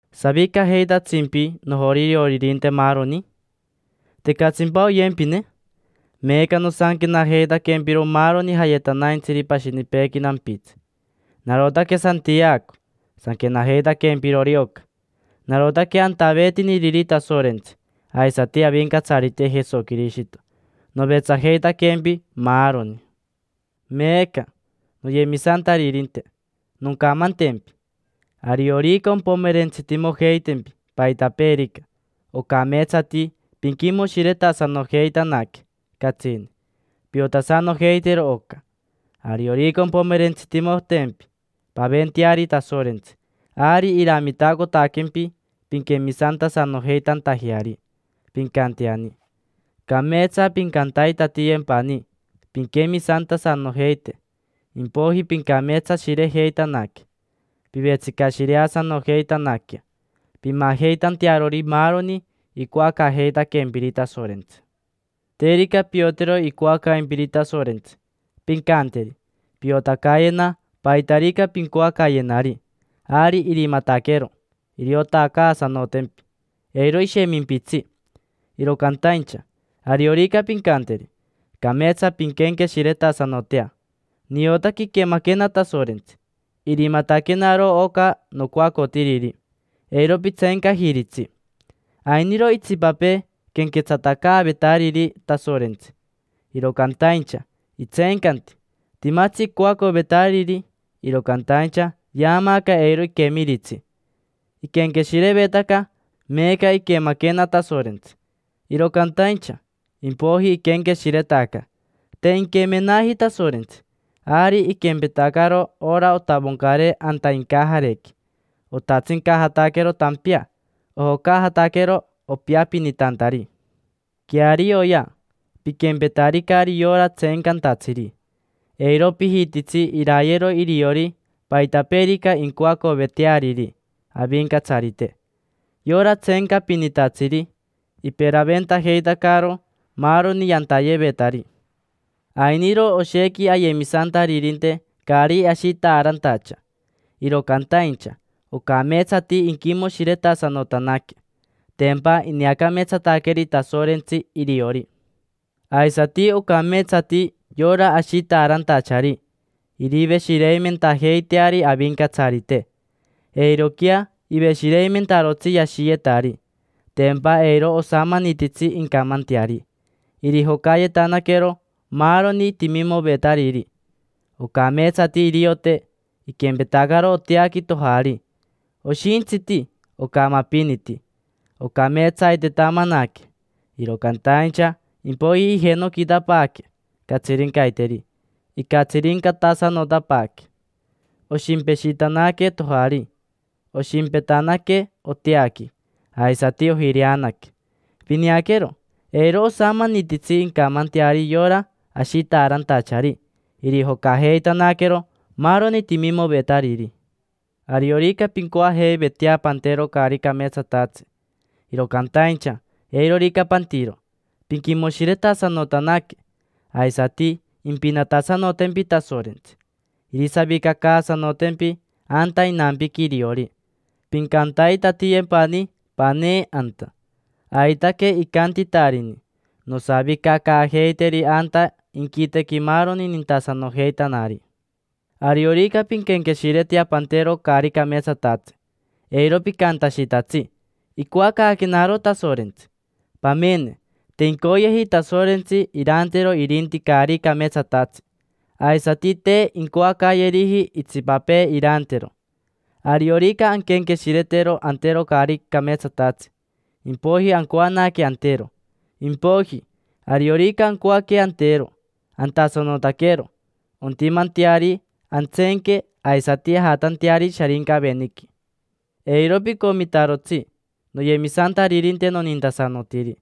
¿Savicajeitatsimpi, nojorioririnte, maaroni? ¿Tecatsimpa oyempine? Meeca nosanquenajeitaquempiro, maaroni jayetanaintsiri pashinipeequi nampitsi. Narotaque Santiaco sanquenajeitaquempirori oca, narotaque antaveetiniriri Tasorentsi aisati Avincatsarite Jesoquirishito. Novetsajeitaquempi, maaroni. Meeca, noyemisantaririnte, noncamantempi: ariorica ompomerentsitimojeitempi paitapeerica, ocameetsati pinquimoshiretasanojeitanaque catsini. Piotasanojeitero oca: ariorica ompomerentsitimotempi, paventeari Tasorentsi, ari iramitacotaquempi pinquemisantasanojeitantajeari, pincanteani. Cameetsa pincantaitatiyempani pinquemisantasanojeite, impoiji pincameetsashirejeitanaque, pivetsicashireasanojeitanaquea: pimajeitantearori maaroni icoacaajeitaquempiri Tasorentsi. Terica piotero icoacaimpiri Tasorentsi, pincanteri: “Piotacayena paitarica pincoacayenari”, ari irimataquero iriotacaasanotempi, eiro ishemimpitsi. Iro cantaincha, ariorica pincanteri, cameetsa pinquenqueshiretasanotea: “Niotaque iquemaquena Tasorentsi, irimataquenaro oca nocoacotiriri”. Eiro pitseencajiritsi. Ainiro itsipapee quenquetsatacaavetariri Tasorentsi, iro cantaincha itseencanti. Timatsi icoacovetariri, iro cantaincha yaamaaca eiro iquemiritsi. Iquenqueshirevetaca: “Meeca iquemaquena Tasorentsi”, iro cantaincha impoiji iquenqueshiretaca: “Te inquemenaji Tasorentsi”. Ari iquempetacaro ora otavoncare anta incajarequi. Otatsincajataquero tampea, ojocaajataquero, opiapinitantari. Quearioya, piquempetaricari yora tseencantatsiri. Eiro pijititsi irayero iriori paitapeerica incoacoveteariri Avincatsarite. Yora tseencapinitatsiri, iperaventajeitacaro maaroni yantayevetari. Ainiro oshequi ayemisantaririnte caari ashitaarantacha, iro cantaincha ocameetsati inquimoshiretasanotanaque: tempa ineacameetsataqueri Tasorentsi iriori. Aisati ocameetsati yora ashitaarantachari iriveshireimentajeiteari Avincatsarite; eiroquea iveshireimentarotsi yashiyetari, tempa eiro osamanititsi incamanteari, irijocayetanaquero maaroni timimovetariri. Ocameetsati iriote iquempetacaro oteaqui tojari: oshintsiti ocamapiniti. Ocameetsaitetamanaque, iro cantaincha impoiji ijenoquitapaaque catsirincaiteri, icatsirincatasanotapaaque. Oshimpeshitanaque tojari; oshimpetanaque oteaqui, aisati ojireanaque. Pineaquero, eiro osamanititsi incamanteari yora ashitaarantachari, irijocajeitanaquero maaroni timimovetariri. Ariorica pincoajeivetea pantero caari cameetsatatsi, iro cantaincha eirorica pantiro, pinquimoshiretasanotanaque, aisati impinatasanotempi Tasorentsi: irisavicacaasanotempi anta inampiqui iriori, pincantaitatiyempani panee anta. Aitaque icantitarini: “Nosavicacaajeiteri anta inquitequi maaroni nintasanojeitanari”. Ariorica pinquenqueshiretea pantero caari cameetsatatsi, eiro picantashitatsi: “Icoacaaquenaro Tasorentsi”. Pamene, te incoyeji Tasorentsi irantero irinti caari cameetsatatsi, aisati te incoacayeriji itsipapee irantero. Ariorica anquenqueshiretero antero caari cameetsatatsi, impoiji ancoanaque antero. Impoiji, ariorica ancoaque antero, antasanotaquero; ontimanteari antseenque, aisati ajatanteari Sharincaveniqui. Eiro picomitarotsi, noyemisantaririnte nonintasanotiri.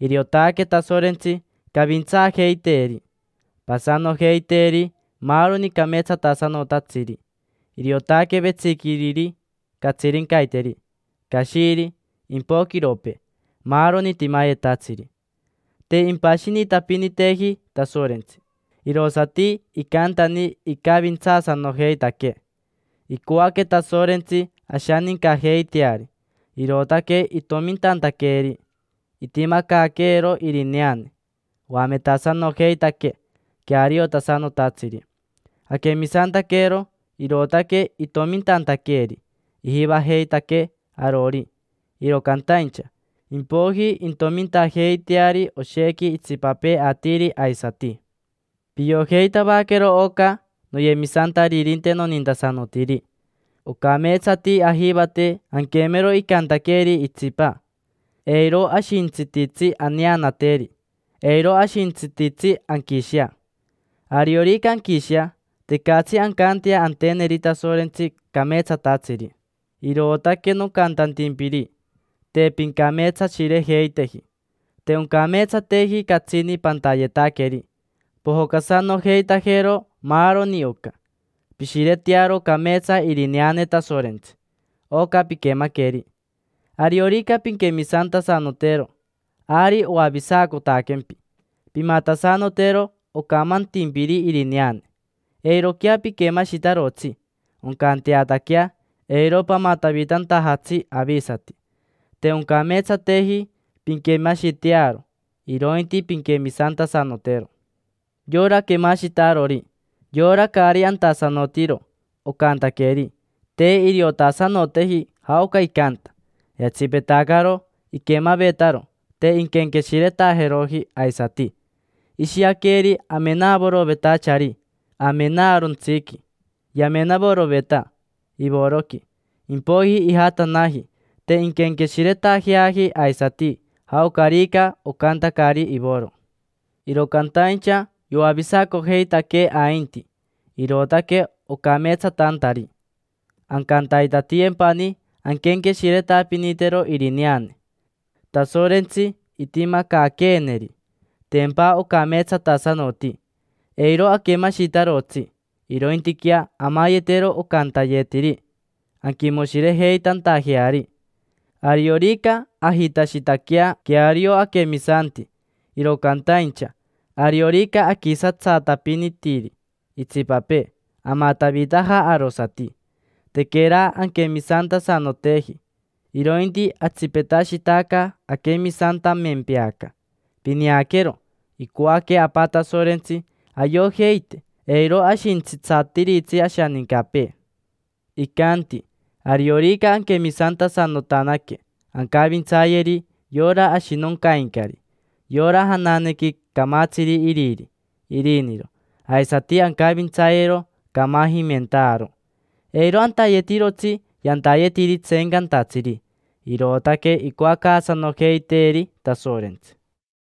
Iriotaque Tasorentsi cavintsaajeiteeri, pasanojeiteeri maaroni cameetsatasanotatsiri. Iriotaque vetsiquiriri catsirincaiteri, cashiri, impoquiropee, maaroni timayetatsiri. Te impashinitapiniteji Tasorentsi, irosati icantani icavintsaasanojeitaquee. Icoaque Tasorentsi ashanincajeiteari, irootaque itomintantaqueeri. Itimacaaqueero irineane, oametasanojeitaquee queariotasanotatsiri. Aquemisantaquero, irootaque itomintantaqueeri. Ijivajeitaquee arori, iro cantaincha impoiji intomintajeiteari oshequi itsipapee atiri aisati. Piojeitavaquero oca, noyemisantaririnte nonintasanotiri: ocameetsati ajivate anquemero icantaqueeri itsipa, eiro ashintsititsi aneanateri, eiro ashintsititsi anquishea. Ariorica anquishea, tecatsi ancantea anteneri Tasorentsi cameetsatatsiri. Irootaque nocantantimpiri: te pincameetsashirejeiteji. Te oncameetsateji catsini pantayetaqueri: pojocasanojeitajero maaroni oca. Pishiretearo cameetsa irineane Tasorentsi, oca piquemaqueri. Ariorica pinquemisantasanotero, ari oavisacotaquempi. Pimatasanotero ocamantimpiri irineane: eiroquea piquemashitarotsi, oncanteataquea eiro pamatavitantajatsi avisati. Te oncameetsateji pinquemashitearo, irointi pinquemisantasanotero. Yora quemashitarori, yora caari antasanotiro ocantaqueri, te iriotasanoteji jaoca icanta; yatsipetacaro iquemavetaro, te inquenqueshiretajeroji aisati. Ishiaqueri amenavorovetachari amenaarontsiqui: yamenavoroveta ivoroqui, impoiji ijatanaji, te inquenqueshiretajeaji aisati jaocarica ocantacari ivoro. Iro cantaincha yoavisacojeitaquee ainti, irootaque ocameetsatantari ancantaitatiyempani anquenqueshiretapinitero irineane Tasorentsi itimacaaqueeneri: tempa ocameetsatasanoti. Eiro aquemashitarotsi, irointiquea amayetero ocantayetiri, anquimoshirejeitantajeari. Ariorica ajitashitaquea queario aquemisanti, iro cantaincha ariorica aquisatsatapinitiri itsipapee, amatavitaja arosati: tequera anquemisantasanoteji, irointi atsipetashitaca aquemisantamempeaca. Pineaquero, icoaque Apa Tasorentsi ayojeite eiro ashintsitsatiritsi ashanincapee. Icanti ariorica anquemisantasanotanaque, ancavintsayeri yora ashinoncaincari: yora jananequi camatsiri iriri, iriniro. Aisati ancavintsayero camajimentaaro, eiro antayetirotsi yantayetiri tseencantatsiri. Irootaque icoacaasanojeiteeri Tasorentsi.